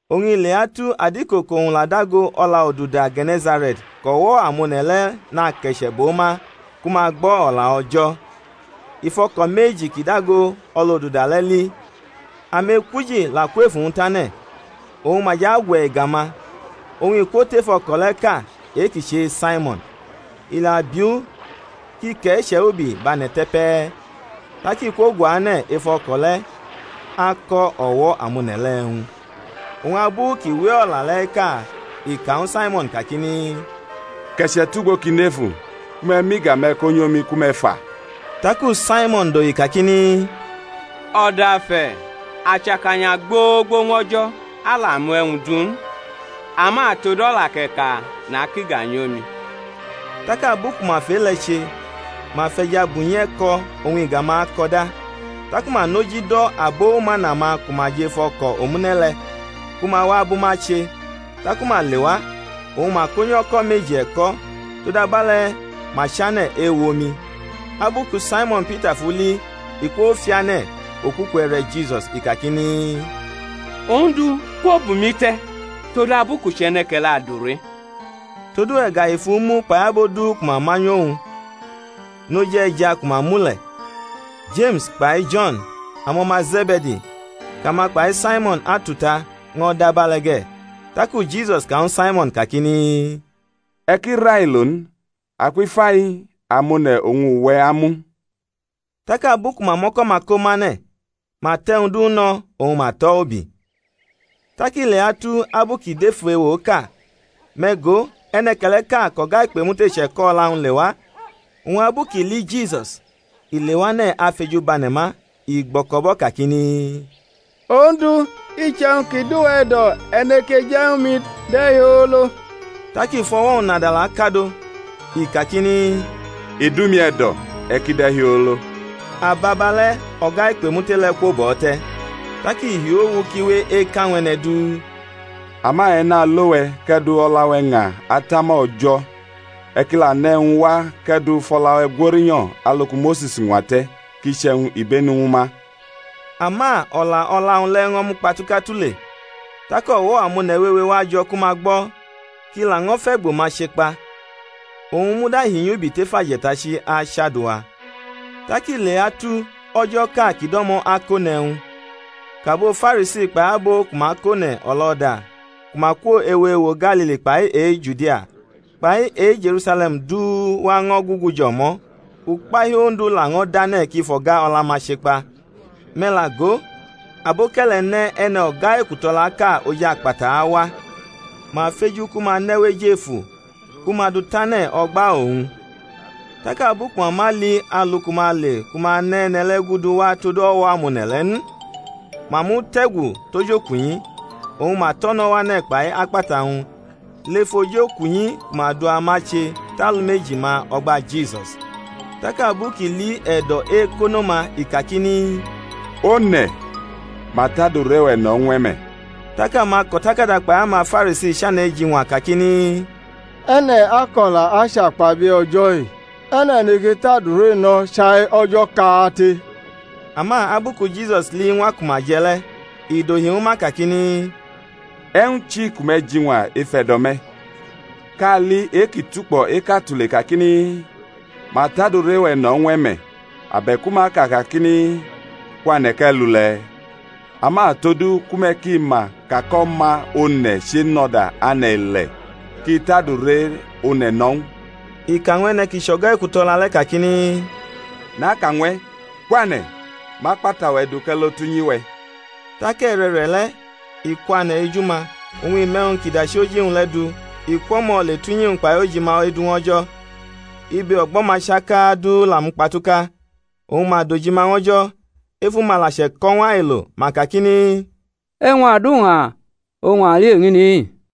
Oñ i leatu adiko kʼowñ la dago o̩lʼoduda Ge̩ne̩sare̩t kʼo̩wo̩-amone̩ le̩ nake̩che̩ bʼo ma ku ma gbo̩ O̩la O̩jo̩; i fʼo̩ko̩ meji ki dago o̩lʼoduda le̩ li, amekwuji la kwʼef uwñ tane̩, oñ ma jʼagwe̩ iga-ma. Oñ i kwo tef o̩ko̩ le̩ʼka, e-kʼi chʼe-Saimo̩n, i la bi u kʼi ke̩che̩ ubi bʼane̩ te̩ pe̩e̩. Tak i kwoguane̩ ef o̩ko̩ le̩ ako̩ o̩wo̩-amone̩ le̩ e̩wñ. Oñ abu kʼi we o̩la le̩ eka i ka ñwu Saimo̩n kakini, Ke̩che̩ tugbo ki nefu ku me̩ mʼiga-me̩ konyʼomi ku me̩ fa. Taku Saimo̩n dohi kakini, O̩dafe̩, a chʼakanya gbogbo ñw o̩jo̩, a la mu e̩wñ du n! ama tod o̩la kʼe̩ ka nakʼiga nyʼomi. Tak abu ku ma fʼe-le̩ che, ma fʼe̩ja bunyi e̩ko̩; oñ iga-ma ako̩da; taku ma nʼoji do̩ abo umana-ma ku ma jʼef o̩ko̩ omune̩ le̩, ku ma wa bʼuma che. Taku ma lewa, oñ ma konyʼo̩ko̩ meji e̩ko̩, todabe̩le̩ ma chane̩ ewomi. Abu ku Saimo̩n Pita fʼu li, i kwofiane̩ okuku e̩re̩ Jisus, i kakini, Ondu, kwo bʼumi te̩, todabu kʼu chʼe̩ne̩ke̩le̩ adure. Todu e̩gahi fʼu mu kpai abo du ku ma manyʼuwñ noj e̩ja ku ma mu le̩; Jeme̩s kpai Jo̩n, amo̩ma Ze̩be̩di kʼama kpai Saimo̩n atuta, ño̩ dʼabe̩le̩ ge̩. Taku Jisus ka ñwu Saimo̩n kakini, E̩ ki railo n; akwifai, amone̩ oñ uwe̩ amu; tak abu ku ma mʼo̩ko̩-ma komʼane̩, ma tʼe̩wñ du no̩, oñ ma tʼo̩ ubi. Tak i leatu abu kʼi dʼef ewoʼka, me̩ go, e̩ne̩ke̩le̩ʼka kʼo̩ga-ikpemute che̩ko̩ o̩la-wñ lewa; oñ abu kʼi li Jisus, i lewane̩ afejubane̩ma, i gbo̩ko̩bʼo̩ kakini, Ondu, iche̩wñ kʼi dʼuwe̩ e̩do̩, e̩ neke je̩ ñwu mi de̩hiolo. Tak i fʼo̩wo̩-wñ nadala kadʼo, i kakini, I dʼumi e̩do̩; e̩ ki de̩hiolo. Ababale̩ o̩ga-ikpemute le̩ kwobʼo̩ te̩. Tak i hiu owu kʼi we eka ñw e̩ne̩ du; ama e̩ nalo we̩, kʼe̩ du o̩la-we̩ ña atama O̩jo̩, e̩ ki la ne̩ e̩wñ wa kʼe̩ du fʼo̩la-we̩ gworinyo̩ alu ku Mose̩s ñwate̩, kʼi chʼe̩wñ ibenu ñwu ma. Ama o̩la o̩la-wñ le̩ ño̩ mukpatuka tule; tak o̩wo̩ amone̩ wewe wajo̩ ku ma gbo̩, kʼi laño̩ fʼe̩gbo-ma chekpa. Owñ muda hinyubi tef aje̩tachi achadua. Tak i leatu o̩jo̩ʼka kʼi do̩mo̩ akʼone̩ e̩wñ, kʼabo Farisi kpai abo ku ma kʼone̩ o̩lo̩da ku ma kwo ewo ewo Galili kpai e-Judia kpai e-Je̩rusale̩m du wa ño̩ gugu jʼo̩mo̩; ukpahiu Ondu laño̩ dʼane̩ kʼi fʼo̩ga o̩la-ma chekpa. Me̩ la go, aboke̩le̩ ne̩ e̩ne̩ o̩ga e̩ku-to̩laʼka oj akpata awa; ma feju ku ma nʼe̩ wʼejefu ku ma dʼu tane̩ o̩gba owñ. Tak abu ku ma ma li alu ku ma ale ku ma ne̩ e̩ne̩ le̩ gudu wa tod o̩wo̩-amone̩ le̩ n, ma mute̩gu tʼojokunyi, oñ ma tʼo̩ no̩ wane̩ kpai akpata-wñ lef ojokunyi ku ma du ama che tʼalumeji-ma o̩gba Jisus. Tak abu kʼi li e̩do̩-ekono-ma i kakini, One̩, ma tʼadure-we̩ no̩ ñw e̩ me̩. Tak amako̩takada kpai amaFarisi chane̩ eji-ñwa kakini, E̩ne̩ ako̩la achakpabie̩ O̩jo̩-i? E̩ne̩ neke tʼadure no̩ chai O̩jo̩ kate? Ama abu ku Jisus li iñwa ku ma je̩ le̩, i dohi ñwu ma kakini, E̩wñ chi ku me̩ jiñwa ef e̩do̩-me̩? Kali e-ki tukpo̩ eka tule kakini, Ma tʼadure-we̩ no̩ ñw e̩ me̩, abe̩ku ma aka kakini, Kwane̩ kʼe̩ lule̩? Ama todu ku me̩ ki ma ka kʼO̩ma One̩ chenʼo̩da ane̩-ile̩ kʼi tʼadure one̩ no̩ ñw u (i ka ñw e̩ne̩ ki chʼo̩ga-ekuto̩la le̩) kakini, Naka ñw e̩, Kwane̩, mʼakpata-we̩ du kʼe̩ lo tʼunyi-we̩. Tak e̩re̩re̩le̩ i kwane̩ eju-ma, oñ i mʼe̩wñ kʼi dachi oji-wñ le̩ du, i kwʼo̩mo̩ le tʼunyi-wñ kpai ojima edu ñw O̩jo̩. Ibe o̩gbo̩-ma chaka du la mukpatuka, oñ ma dojima ñw O̩jo̩; efu-ma la che̩ko̩ ñw ailo, ma kakini, E̩wñ-aduña oñ a li eñini.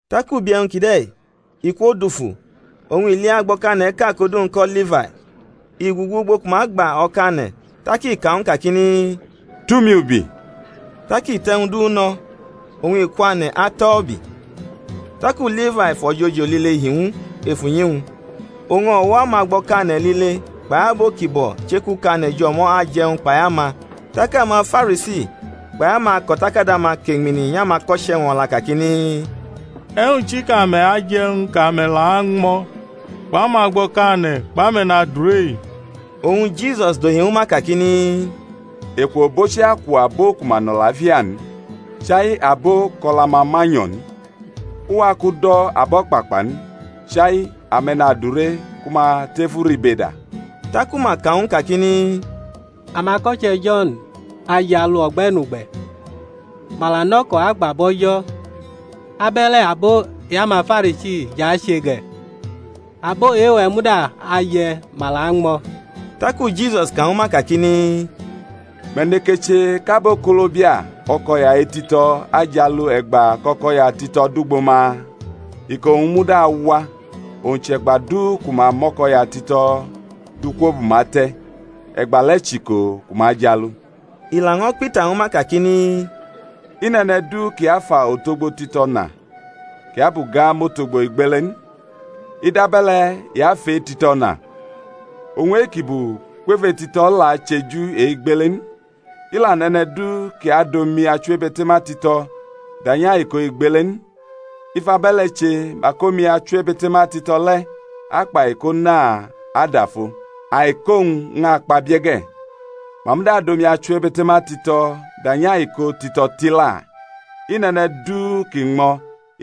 Tak ubi e̩wñ kide̩-i i kwodufu oñ i li agbo̩kane̩ʼka kʼodu-wñ ko̩ Lifai, i gugu ugbo ku ma gba o̩kane̩, tak i ka ñw u kakini, Tʼumi ubi. Tak i tʼe̩wñ du no̩, oñ i kwane̩ atʼo̩ ubi. Taku Lifai fʼo̩jojo lile hi ñw u ef unyi-wñ; oñ o̩wo̩ amagbo̩kane̩ lile kpai abo ki bo̩ chekukane̩ jʼo̩mo̩ aje̩wñ kpai ama. Tak amaFarisi kpai amako̩takada-ma keñmini nyʼamako̩che̩-wñ o̩la kakini, E̩wñ chi kʼame̩ aje̩wñ, kʼame̩ la añmo̩ kpʼamagbo̩kane̩ kpʼame̩nadure-i? Oñ Jisus dohi ñwu ma kakini, Eku obochi aku abo ku ma nʼo̩lafia n, chai abo kʼo̩la-ma ma nyo̩ n. U wa kʼu do̩ abo̩kpakpa n chai ame̩nadure ku ma lef uribeda. Taku ma ka ñw u kakini Amako̩che̩ Jo̩n ajialu o̩gbe̩nugbe̩, ma la nʼo̩ko̩ agba bʼO̩jo̩: abe̩le̩ abo e-amaFarisi jʼache ge̩; abo e-we̩ muda aje̩ ma la añmo̩. Taku Jisus ka ñwu ma kakini, Me̩ neke che kʼabokolobia o̩ko̩ya-etito̩ ajialu e̩gba kʼo̩ko̩ya tito̩ dugbo ma? Iko-wñ muda awa; owñ chʼe̩gba du ku ma mʼo̩ko̩ya tito̩ du kwobʼuma te̩, e̩gbale̩ chʼiko ku ma ajialu. I laño̩ kpita ñwu ma kakini, I nʼe̩ne̩ du ki afa otogbo tito̩ na kʼi abʼu ga mʼotogbo igbele n; i dabe̩le̩ i afʼetito̩ na, oñ e-kʼi bu kwef e-tito̩ la acheju e-igbele n. I la nʼe̩ne̩ du kʼi adʼomi-achiwebe̩te̩ma tito̩ danyʼaiko igbele n; i fʼabe̩le̩ che mak omi achiwebe̩te̩ma tito̩ le̩ akpʼaiko na adafo, aiko-wñ ñʼakpabie̩ ge̩. Ma muda adʼomi-achiwebe̩te̩ma tito̩ danyʼaiko tito̩ tila. I nʼe̩ne̩ du ki ñmo̩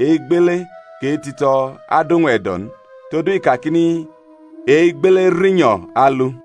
e-igbele kʼe-tito̩ adʼowñ e̩do̩ n; todu i kakini, E-igbele rinyo̩ alu.